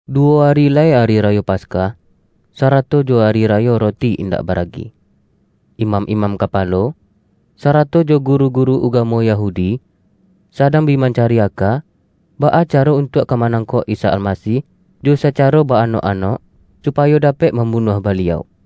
Duwo ari lai Ari Rayo Paskah, sarato jo Ari Rayo Roti Indak Baragi. Imam-imam kapalo, sarato jo guru-guru ugamo Yahudi, sadang bi mancari aka, baa caro untuak ka ma-nangkok Isa Almasih, jo sacaro ba-anok-anok, supayo dapek mambunuah Baliau.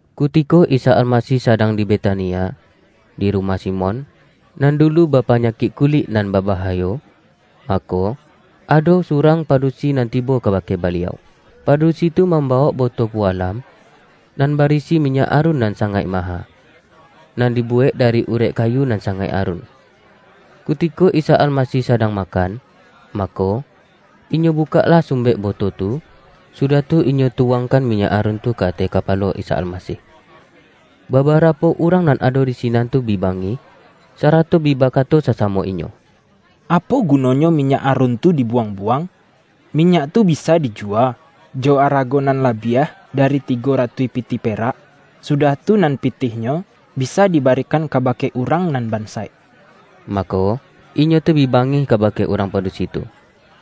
Kutiko Isa Almasih sadang di Betania, di rumah Simon, nan dulu bapanyakik ku-lik nan babahayo, mako, ado surang padu-si nan tibo kabake Baliau. Padusi tu mam-bawok boto pualam, nan barisi minyak arun nan sangaik maha, nan dibuwek da-ri urek kayu nan sangaik arun. Kutiko Isa Almasih sadang makan, mako, inyo bu-kaklah sumbek boto tu, sudah tu inyo tu-wangkan minyak arun tu ka ateh kapa-lo Isa Almasih. Babarapo urang nan ado di sinan tu bi bangih, sarato bi bakato sa-samo inyo,”Apo gunonyo minyak arun tu dibuwang-buwang? Minyak tu bisa diju-wa, jo arago nan labiah dari tigo ratuih pi-tih perak, sudah tu nan pitihnyo bisa di ba-rikan kabake urang nan bansaik!” Mako, inyo tu bi bangih kabake urang padusi tu.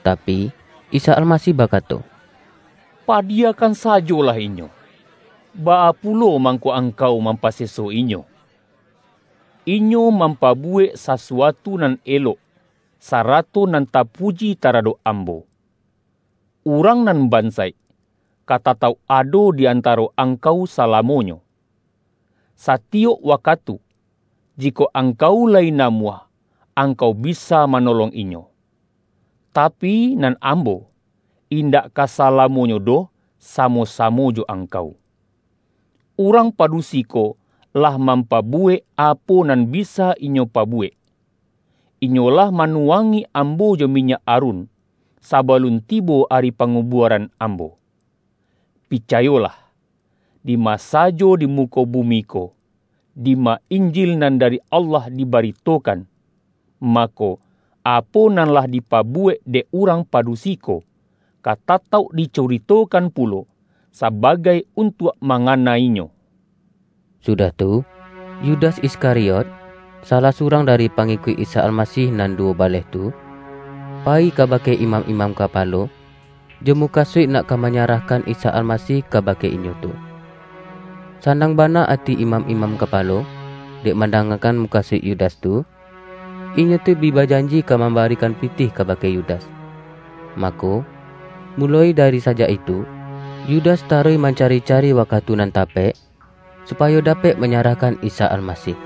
Tapi, Isa Almasih bakato,”Padiyakan sajolah inyo! Baa pulo mangko angkau mampaseso inyo? Inyo mampabuwek sasu-atu nan elok sarato nan tapuji taradok Am-bo. Urang nan bansaik, ka tatauk ado di antaro angkau salamonyo. Satiyok wakatu, jikok angkau lai namuah, angkau bisa ma-nolong inyo. Tapi, nan Ambo, indak ka sala-monyo doh samo-samo jo angkau. Urang padusi ko lah mampabuwek, apo nan bisa inyo pabuwek. Inyolah manuwangi Ambo jo minyak arun, sabalun tibo ari pangubua-ran Ambo. Picayolah! Dima sajo di muko bumi ko, dima Injil nan dari Allah dibari-tokan, mako, apo nan lah dipabuwek dek urang padusi ko, ka tatauk dicuritokan pu-lo, sabagai untuak mangana inyo.” Sudah tu, Yudas Iskariot, salah surang dari pangikuik Isa Almasih nan duwo baleh tu, payi kabake imam-imam kapalo, jo mu-kasuik nak ka manyarahkan Isa Almasih, kabake inyo tu. Sanang bana ati imam-imam kapalo, dek mandangakan muka-suik Yudas tu, inyo tu bi bajanji ka mamba-rikan pitih kabake Yudas. Mako, muloi dari sajak itu, Yudas taruih mancari-cari waka-tu nan tapek, supayo dapek manyarahkan Isa Almasih.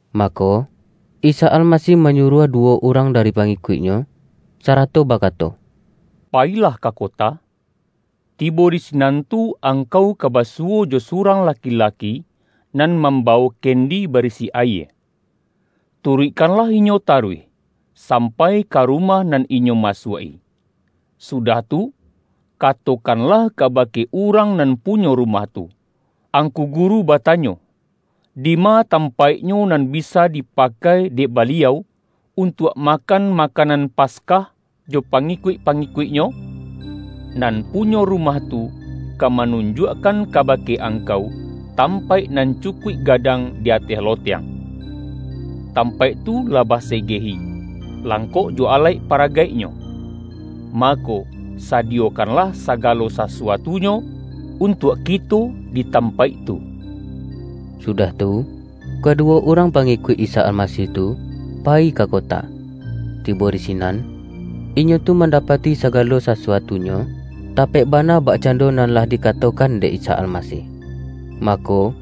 Mako, Isa Almasih manyuruah duwo urang dari pangikuik-Nyo, sa-rato bakato,”Payilah ka kota, tibo di sinan tu angkau ka basuwo jo surang laki-laki, nan mambawok kendi bari-si ayie. Turuikkanlah inyo taruih, sampai ka rumah nan inyo masuak-i, sudah tu katokanlah kabake urang nan punyo rumah tu, Angku Guru batanyo, dima tampaiknyo nan bi-sa dipakai dek Baliau, untuak makan makanan Paskah jo pangikuik-pangi-kuik-Nyo?' Nan punyo rumah tu, ka manunjuakkan kabake angkau, tampaik nan cukuik gadang di ateh loteng. Tampaik tu lah basegehi, langkok jo alaik-paragaiknyo. Mako, sadiyokan-lah sagalo sasuatunyo untuak kito di tampaik tu.” Sudah tu, kaduwo urang pangi-kuik Isa Almasih tu, payi ka kota. Ti-bo di sinan, inyo tu mandapati sagalo sasuatunyo, tapek bana bakcando nan lah dikatokan dek Isa Almasih. Mako,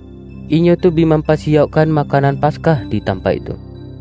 inyo tu bi mampasiyaukkan makanan Paskah di tampaik tu.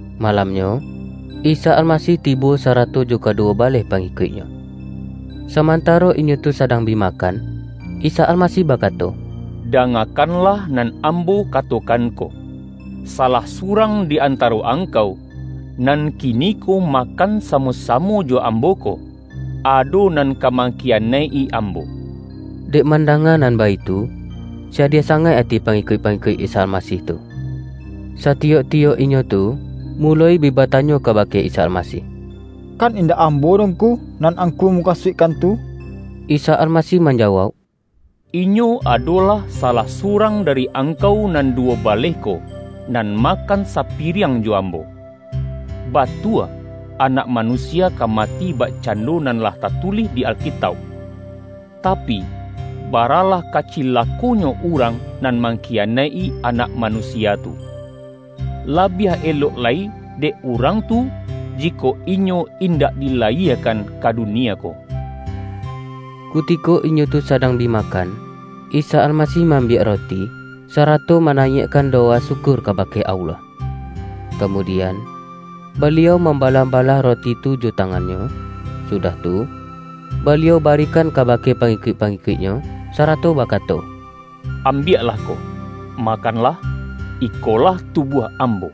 Malamnyo, Isa Almasih tibo sa-rato jo kaduwo baleh pangikuik-Nyo. Samantaro inyo tu sadang bi ma-kan, Isa Almasih bakato,”Dangakan-lah nan Ambo katokan ko: salah surang di antaro angkau, nan kiniko makan samo-samo jo Ambo ko, ado nan ka mangkiyanaik-i Ambo.” Dek mandanga nan baitu, sadiah sangaik ati pangikuik-pangikuik Isa Al-masih tu. Satiyok-tiyok inyo tu, muloi bi batanyo kabake Isa Almasih,”Kan indak ambo doh Ngku, nan Angku mu-kasuikkan tu?” Isa Almasih manjawauk,”Inyo adolah salah surang dari angkau nan duwo baleh ko, nan makan sapiriang jo Ambo. Batua Anak Manusia ka mati bakcando nan lah tatulih di Alkitauk. Tapi, baralah ka cilakonyo urang nan mangkiyanaik-i Anak Manusia tu! La-biah elok lai dek urang tu, jikok inyo indak dilayiekan ka dunie ko!” Kutiko inyo tu sadang bi makan, Isa Almasih ma-ambiak roti, sarato ma-nayiakkan dowa syukur kabake Allah. Kamudian, Baliau mambalah-balah ro-ti tu jo tangan-Nyo, sudah tu, Baliau barikan kabake pangikuik-pangikuik-Nyo, sarato bakato,”Ambiaklah ko, makanlah, ikolah tubuah Ambo.”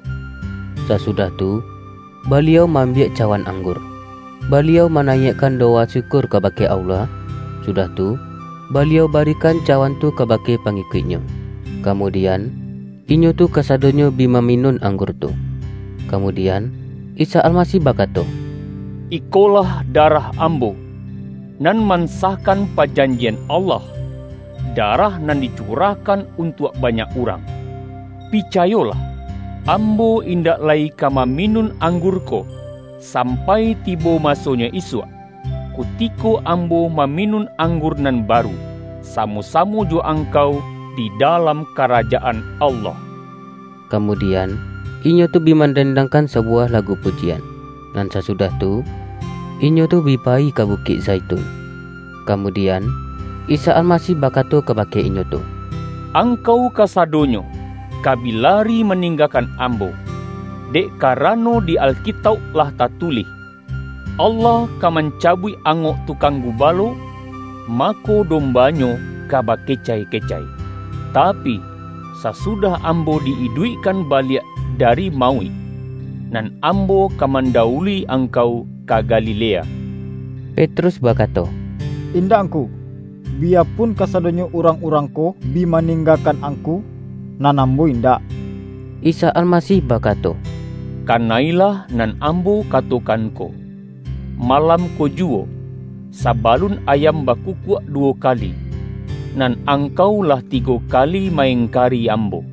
Sasudah tu, Baliau ma-ambiak ca-wan anggur. Baliau manayiakkan dowa syukur kabake Allah, sudah tu, Baliau barikan cawan tu kabake pangikuik-Nyo. Kamudian, inyo tu kasadonyo bi maminun anggur tu. Kamudian, Isa Almasih bakato,”Ikolah darah Ambo, nan mansahkan pajanjian Allah, darah nan dicurahkan untuak banyak urang. Picayolah: Ambo indak lai ka mami-nun anggur ko, sampai tibo masonyo isuak, kutiko Ambo maminun anggur nan baru, samo-samo jo angkau di da-lam Karajaan Allah.” Kamudian, inyo tu bi mandendang-kan sabuwah lagu pujian. Nan sasudah tu, inyo tu bi payi ka Bukik Zaitun. Kamudian, Isa Almasih bakato ka-bake inyo tu,”Angkau kasadonyo ka bi lari maninggakan Ambo. Dek karano di Alkitauk lah tatulih, ’Allah ka man-cabuik anggok tukang gubalo, mako, dombanyo ka bakecai-kecai.’ Tapi, sasudah Ambo di-iduikkan baliak da-ri mauik, nan Ambo ka mandawului angkau ka Galilea.” Petrus bakato,”Indak Ngku, biya-pun kasadonyo urang-urang ko bi ma-ninggakan Angku, nan ambo indak.” Isa Almasih bakato,”Kana-ilah nan Ambo katokan ko, malam ko juwo, saba-lun ayam bakukuak duwo kali, nan ang-kau lah tigo kali ma-engkari Ambo.”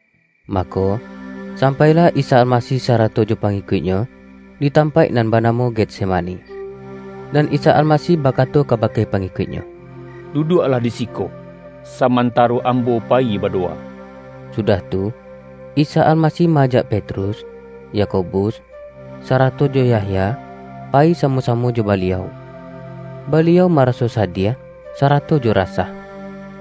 Mako, sampailah Isa Almasih sa-rato jo pangikuik-Nyo, di tampaik nan banamo Getsemani, nan Isa Almasih bakato kabake pangikuik-Nyo,”Du-duaklah di siko, samantaro Ambo pa-yi badowa.” Sudah tu, Isa Almasih ma-ajak Petrus, Yakobus, sarato jo Yahya, pa-yi samo-samo jo Baliau. Baliau ma-raso sadiah, sarato jo rasah.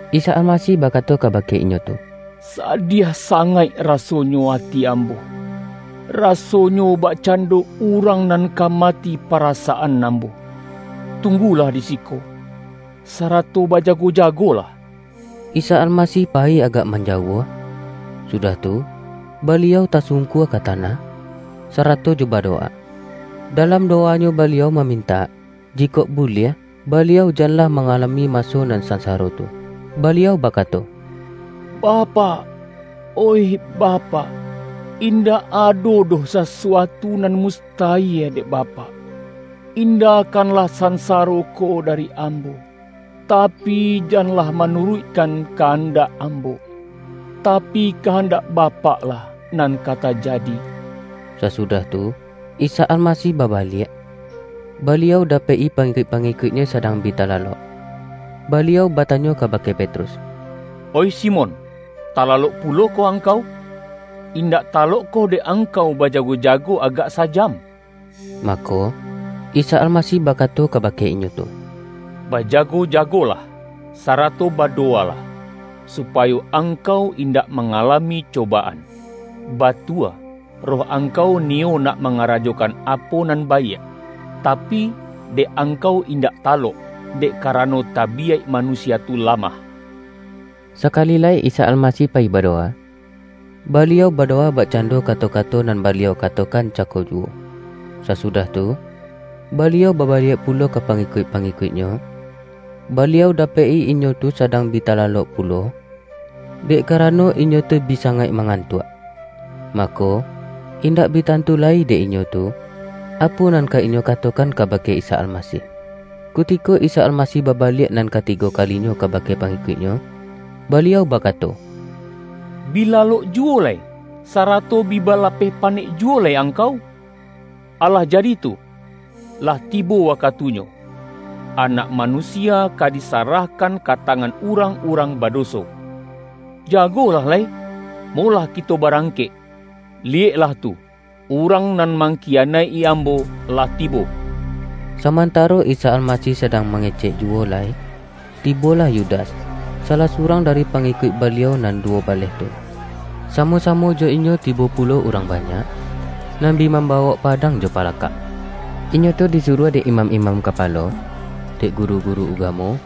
Isa Almasih bakato kabake inyo tu,”Sa-diah sangaik rasonyo ati Ambo, raso-nyo bakcando urang nan ka mati para-saan Ambo. Tunggulah di siko, sarato bajago-jagolah!” Isa Almasih payi agak manjauah, sudah tu Baliau tasungkua ka tanah, sarato jo badowa. Dalam dowa-Nyo Baliau mamintak, jikok buliah Baliau janlah mangalami maso nan sansaro tu. Baliau bakato,”Bapak, oih Bapak, in-dak ado doh sasuatu nan mustayie dek Bapak. Indakanlah sansaro ko dari Ambo. Tapi, janlah manuruikkan kahandak Ambo, tapi, kahandak Bapak-lah nan ka tajadi.” Sasudah tu, Isa Almasih babaliak, Baliau dapek-i pangikuik-pangikuik-Nyo sadang bi talalok. Baliau bata-nyo kabake Petrus,”Oih Simon, tala-lok pulokoh angkau? Indak talokkoh dek angkau bajago-jago agak sa-jam?” Mako, Isa Almasih bakato kabake inyo tu,”Bajago-jagolah, sarato bado-walah, supayo angkau indak manga-lami cobaan. Batua roh angkau niyo nak mangarajokan apo nan baiak, ta-pi, dek angkau indak talok, dek kara-no tabiyaik manusia tu lamah.” Sakali lai Isa Almasih payi badowa, Baliau badowa bakcando kato-kato nan Baliau katokan cako juwo. Sasudah tu, Baliau babaliak pulo ka pangikuik-pangikuik-Nyo, Baliau dapek-i inyo tu sadang bi talalok pulo, dek karano inyo tu bi sangaik mangantuak. Mako, indak bi tantu lai dek inyo tu, apo nan ka inyo katokan kabake Isa Almasih. Kutiko Isa Almasih babaliak nan katigo kalinyo kabake pangikuik-Nyo, Baliau bakato,”Bi lalok juwo lai, sa-rato bi balapeh panek juwo lai ang-kau? Alah jadi tu! Lah tibo wakatu-nyo, Anak Manusia ka disarahkan ka tangan urang-urang badoso. Jago-lah lai, molah kito barangkek. Liyeklah tu! Urang nan mangkiyanaik-i Ambo lah tibo!” Samantaro Isa Almasih sadang mangecek juwo lai, tibolah Yudas, sa-lah surang dari pangikuik Baliau nan duwo baleh tu. Samo-samo jo inyo ti-bo pulo urang banyak, nan bi mam-bawok padang jo palakak. Inyo tu di-suruah dek imam-imam kapalo, dek guru-guru ugamo,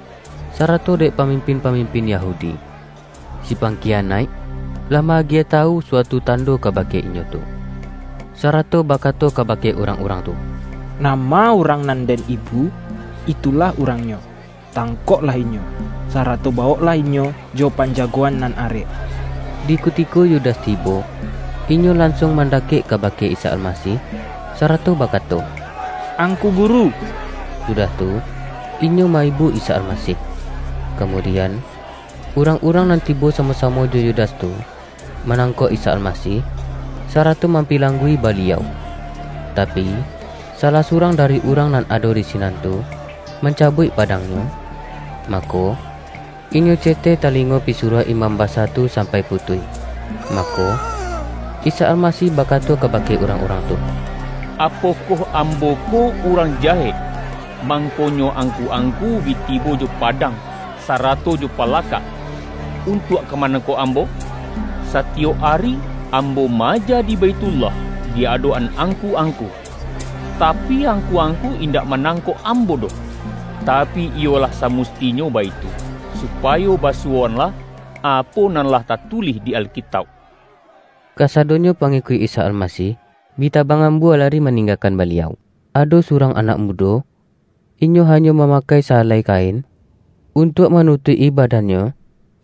sarato dek pamim-pin-pamimpin Yahudi. Si pangkiya-naik, lah ma-agiah tawu suatu tando kabake inyo tu. Sarato bakato kaba-ke urang-urang tu,”Nama urang nan den ibu, itulah Urangnyo. Tangkoklah Inyo, sarato bawoklah Inyo jo panja-goan nan arek.” Di kutiko Yudas tibo, inyo lan-suang mandakek kabake Isa Almasih, sarato bakato,”Angku Guru!” sudah tu, inyo ma-ibu Isa Almasih. Kamu-dian, urang-urang nan tibo samo-samo jo Yudas tu, manangkok Isa Almasih, sarato mampilanggu-i Baliau. Tapi, salah surang dari urang nan ado di si-nan tu, mancabuik padangnyo, mako, inyo ceteh talingo pisuruah imam basa tu sampai putuih. Mako, Isa Almasih bakato kabake urang-urang tu,”Apo-koh Ambo ko urang jahek, mangkonyo angku-angku bi tibo jo padang, sara-to jo palakak, untuak ka manangkok Ambo? Satiyok ari, Ambo ma-aja di Baithullah di adok-an angku-ang-ku, tapi, angku-angku indak manang-kok Ambo doh. Tapi, iyolah samusti-nyo baitu, supayo basuwoanlah, apo nan lah tatulih di Alkitauk.” Kasadonyo pangikuik Isa Almasih, bi tabang ambua lari maninggakan Baliau. Ado surang anak mudo, inyo hanyo mamakai sa-alai kain, untuak manu-tuik-i badannyo,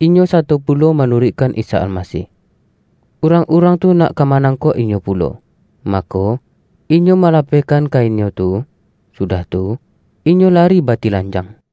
inyo sato pulo manu-ruikkan Isa Almasih. Urang-urang tu nak ka manangkok inyo pulo, mako, inyo malapehkan kainnyo tu, sudah tu, inyo lari batilanjang.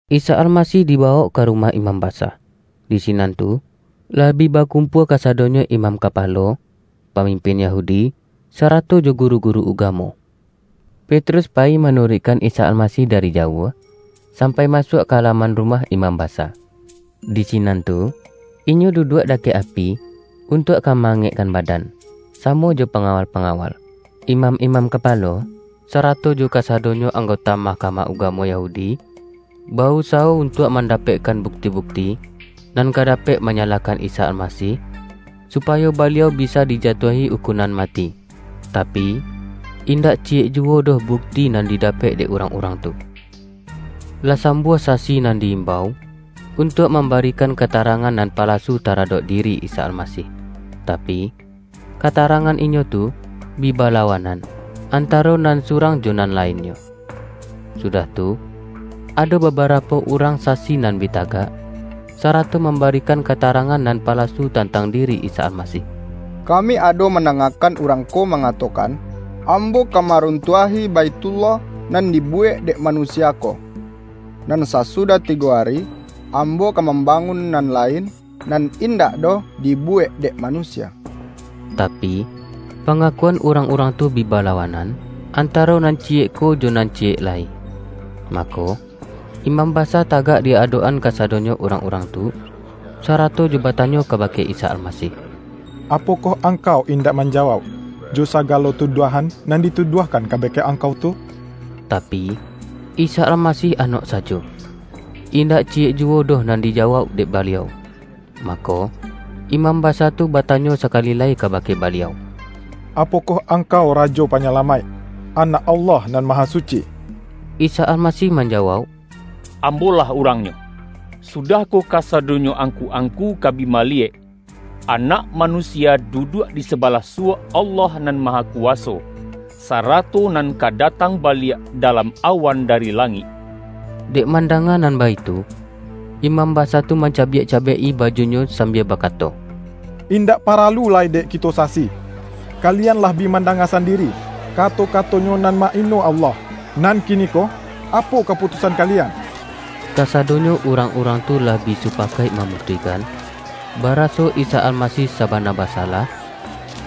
Isa Almasih dibawok ka rumah imam basa. Di sinan tu, lah bi bakum-pua kasadonyo imam kapalo, pamim-pin Yahudi, sarato jo guru-guru uga-mo. Petrus payi manuruikkan Isa Almasih dari jauah, sampai masuak ka alaman rumah imam basa. Di sinan tu, inyo duduak dakek api, untuak ka ma-angekkan badan, samo jo panga-wal-pangawal. Imam-imam kapalo, sarato jo kasadonyo anggota Mahka-mah Ugamo Yahudi, ba-usawo untuak mandapekkan bukti-bukti, nan ka da-pek manyalahkan Isa Almasih, supa-yo Baliau bisa dijatuahi ukunan mati. Tapi, indak ciyek juwo doh bukti nan didapek dek urang-urang tu. Lah sambuah sasi nan di-imbau, untuak mambarikan katarangan nan palasu taradok diri Isa Almasih, tapi, kata-rangan inyo tu, bi balawanan, antaro nan surang jo nan lainnyo. Sudah tu, ado babarapo urang sasi nan bi tagak, sarato mambarikan ka-tarangan nan palasu tantang diri Isa Almasih, ”Kami ado mandangakan Urang ko mangatokan, ’Ambo ka ma-runtuahi Baithullah nan dibuwek dek manusia ko, nan sasudah tigo ari, Ambo ka mambangun nan lain, nan indak doh dibuwek dek manusia.’” Tapi, panga-kuan urang-urang tu bi balawanan, an-taro nan ciyek ko, jo nan ciyek lai. Mako, imam basa tagak di adok-an kasadonyo urang-urang tu, sarato jo batanyo kabake Isa Almasih,”Apo-koh Angkau indak manjawauk, jo sa-galo tuduahan nan dituduahkan ka-bake Angkau tu?” Tapi, Isa Almasih anok sajo. Indak ciyek juwo doh nan dijawauk dek Baliau. Mako, imam basa tu batanyo sakali lai kabake Baliau,”Apokoh Ang-kau Rajo Panyalamaik, Anak Allah Nan Mahasuci?” Isa Almasih manjawauk,”Ambo-lah Urang-Nyo, sudah ko kasadonyo angku-angku ka bi maliyek, Anak Ma-nusia duduak di sabalah suwok Allah Nan Mahakuwaso, sarato nan ka datang baliak dalam awan dari langik!” Dek mandanga nan baitu, imam basa tu mancabiak-cabiak-i bajunyo sambia bakato,”Indak paralu lai dek kito sasi! Kalian lah bi manda-nga sandiri, kato-kato-Nyo nan ma-ino Allah. Nan kiniko, apo kaputus-an kalian?” Kasadonyo urang-urang tu lah bi supa-kaik mamutuihkan, baraso Isa Almasih sabana basalah,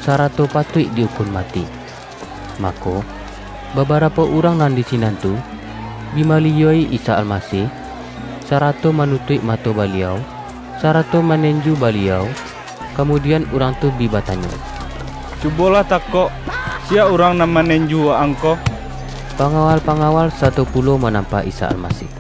sarato patuik di-ukun mati. Mako, babarapo urang nan di si-nan tu, bi maliyua-i Isa Almasih, sara-to manutuik mato Baliau, sarato ma-nenju Baliau, kamudian urang tu bi batanyo,”Cubolah takok, siya urang nan manenju Wa-ang ko?” Panga-wal-pangawal sato pulo manampa Isa Almasih.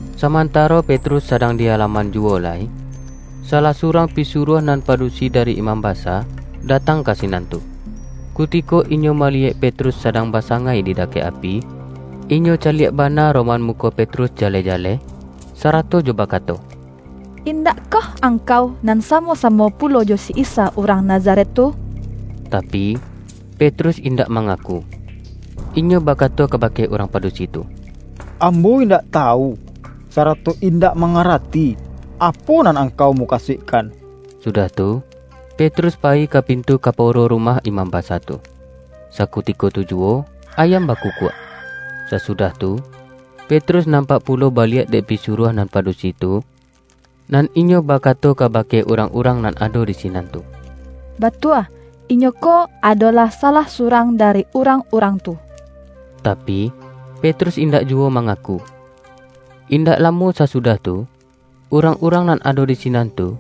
Samantaro Petrus sadang di ala-man juwo lai, salah surang pisuruah nan padusi dari imam basa, datang ka sinan tu. Kutiko inyo maliyek Petrus sadang basangai di dakek api, inyo caliak bana roman muko Petrus jaleh-jaleh, sarato jo bakato,”Indak-koh angkau nan samo-samo pulo jo si Isa urang Nazaret tu?” Tapi, Petrus indak mangaku. Inyo bakato kabake urang padusi tu,”Ambo indak tawu, sarato indak mangarati, apo nan angkau mukasuikkan.” Su-dah tu, Petrus payi ka pintu kaporo rumah imam basa tu. [Sakutiko tu ju-wo, ayam bakukuak.] Sasudah tu, Petrus nampak pulo baliak dek pisuruah nan padusi tu, nan inyo bakato kabake urang-urang nan ado di sinan tu,”Batua, inyo ko, adolah salah surang dari urang-urang tu!” Tapi, Petrus indak juwo ma-ngaku. Indak lamo sasudah tu, urang-urang nan ado di sinan tu,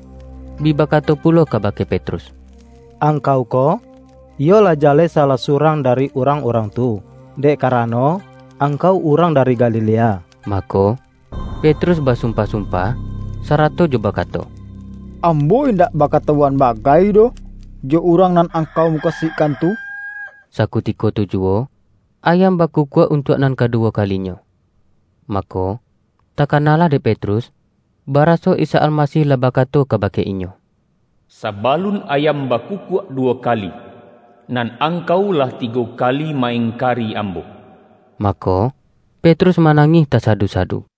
bi bakato pulo ka-bake Petrus,”Angkau ko, iyo lah jaleh salah surang dari urang-urang tu, dek karano, angkau urang dari Galilea!” Mako, Petrus basumpah-sumpah, sarato jo bakato,”Ambo indak baka-tawuan bagai doh, jo Urang nan ang-kau mukasuikkan tu!” Sakutiko tu juwo, ayam bakukuak untuak nan kaduwo kalinyo. Mako, ta-kanalah dek Petrus, baraso Isa Almasih lah bakato kabake inyo,”Sabalun ayam bakukuak duwo kali, nan angkau, lah tigo kali ma-engkari Ambo.” Mako, Petrus manangih tasadu-sadu.